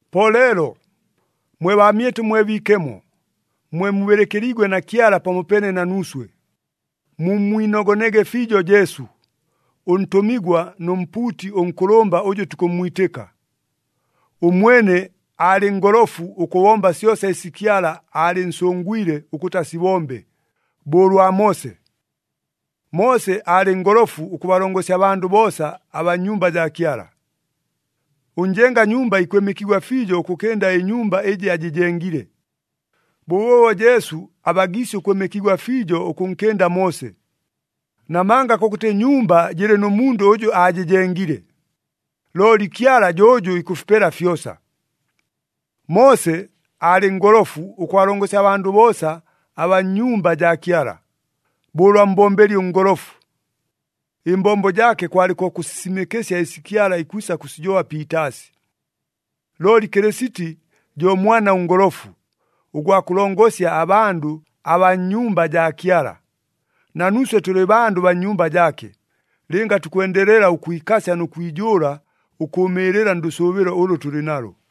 Po leelo, mwe baamyɨtʉ mwe biikemo, mwe mubɨlɨkɨliigwe na Kyala pamopeene na nuuswe, mummwinogonege fiijo Jesu, ʉntʉmigwa nʉ mpuuti ʉnkʉlʉmba ʉjʉ tukʉmmwitɨka. Ʉmwene aalɨ ngolofu ʉkʉbomba syosa ɨsi Kyala aalɨnsʉngwile ʉkʉtɨ asibombe, bo ʉlwa Moose. “Moose aalɨ ngolofu ʉkʉbalongosya abandʉ boosa abaa nnyumba jaa Kyala.” Ʉnjenga nyumba ikwɨmɨkigwa fiijo ʉkʉkɨnda ɨnyumba ɨjɨ ajɨjengile. Bʉbʉʉbo Jesu abagiisye ʉkwɨmɨkigwa fiijo ʉkʉnkɨnda Moose. Namanga kʉkʉtɨ nyumba jɨlɨ nʉ mundʉ ʉjʉ aajɨjengile, looli Kyala jo ʉjʉ ikʉfipela fyosa. “Moose aalɨ ngolofu ʉkʉbalongosya abandʉ boosa abaa nnyumba jaa Kyala,” bo ʉlwa mbombeli ʉngolofu. Ɨmbombo jaake kwalɨ ko kʉsisimɨkɨsya ɨsi Kyala ikwisa kʉsijoba piitaasi. Looli Kɨlɨsiti jo Mwana ʉNgolofu, ʉgwa kʉlongosya abandʉ abaa nnyumba jaa Kyala. Na nuuswe tʉlɨ bandʉ baa nnyumba jaake, lɨnga tukwendelela ʉkwikasya nʉ kwijʉʉla ʉkʉʉmɨɨlɨla ndʉsʉʉbɨlo ʉlʉ tʉlɨ nalo.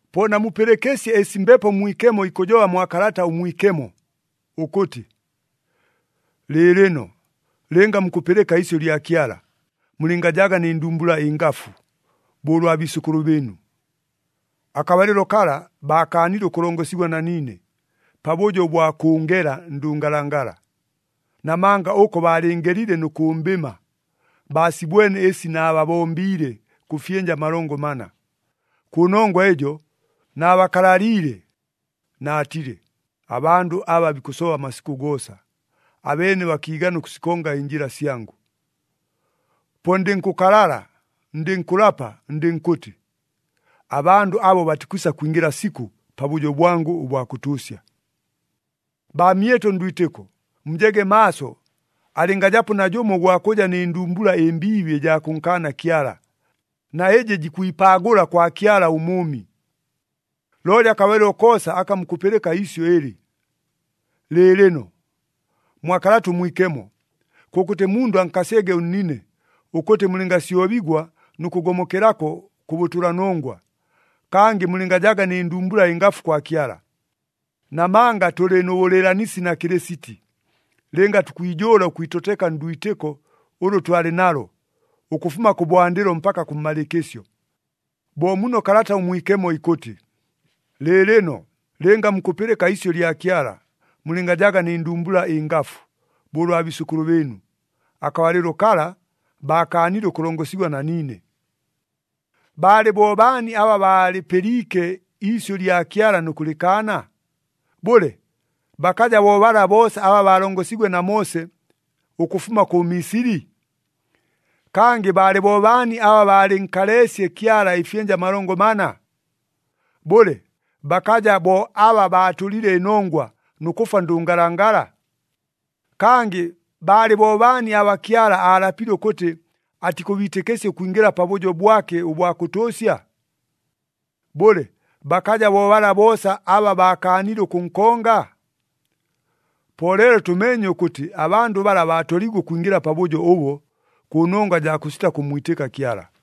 Po namupɨlɨkɨsye ɨsi Mbepo Mwikemo ikʉjoba mwa Kalata ʉMwikemo, ʉkʉtɨ, “Lɨɨlɨno, lɨnga mukʉpɨlɨka iisyʉ lya Kyala, mulɨngajaga nɨ ndumbula ɨngafu, bo ʉlwa biisʉkʉlʉ bɨɨnu. Akabalɨlo kala, baakaanile ʉkʉlongosigwa na niine, pabʉjo ʉbwa kʉʉngela ndʉngalangala. Namanga ʉko baalɨɨngelile nʉ kʉmbɨma, baasibwene ɨsi naababombiile kʉ fyɨnja amalongo mana. Kʉnongwa ɨjo, naabakalaliile, naatile, ‘Abandʉ aba bikʉsoba amasikʉ goosa, abeene bakiigana ʉkʉsikonga ɨnjɨla syangʉ.’ Po ndɨnkʉkalala, ndɨnkʉlapa, ndɨnkʉtɨ, ‘Abandʉ abo batikwisa kwingɨla sikʉ, pabʉjo bwangʉ ʉbwa kʉtʉʉsya.’” Baamyɨtʉ ndwitɨko, mujege maaso alɨngajapo najʉmo ʉgwa kʉja nɨ ndumbula ɨmbiibi ɨjaa kʉnkaana Kyala, na ɨjɨ jikwipaagʉla kwa Kyala ʉMʉʉmi. Looli akabalɨlo koosa aka mukʉpɨlɨka iisyʉ ɨlɨ, “Lɨɨlɨno,” mwa Kalata ʉMwikemo, kʉkʉtɨ mundʉ ankasyege ʉnnine, ʉkʉtɨ mulɨngasyobigwa nʉ kʉgomokelako kʉ bʉtʉlanongwa, kangɨ mulɨngajaga nɨ ndumbula ɨngafu kwa Kyala. Namanga tʉlɨ nʉ bʉlɨɨlanisi na Kɨlɨsiti, lɨnga tukwijʉʉla ʉkwitoteka ndwitɨko ʉlʉ twalɨ nalo, ʉkʉfuma kʉbwandɨlo mpaka kʉmmalɨɨkɨsyo. Bo muno Kalata ʉMwikemo ikʉtɨ, “Lɨɨlɨno, lɨnga mukʉpɨlɨka iisyʉ lya Kyala, mulɨngajaga nɨ ndumbula ɨngafu, bo ʉlwa biisʉkʉlʉ bɨɨnu. Akabalɨlo kala, baakaanile ʉkʉlongosigwa na niine.” Baalɨ bo baani aba baalɨpɨliike iisyʉ lya Kyala nʉ kʉlɨkaana? Bʉle, bakaja bo bala boosa aba baalongosiigwe na Moose, ʉkʉfuma kʉ Misili? Kangɨ baalɨ bo baani aba baalɨnkaleesye Kyala ɨfyɨnja amalongo mana? Bʉle, bakaja bo aba baatʉlile ɨnongwa, nʉ kʉfwa ndʉngalangala? Kangɨ baalɨ bo baani aba Kyala aalapile ʉkʉtɨ atikʉbiitɨkɨsya ʉkwingɨla pabʉjo bwake ʉbwa kʉtʉʉsya? Bʉle, bakaja bo bala boosa aba baakaanile ʉkʉnkonga? Po leelo tʉmeenye ʉkʉtɨ abandʉ bala baatoliigwe ʉkwingɨla pabʉjo ʉbo, kʉnongwa jaa kʉsita kʉmmwitɨka Kyala.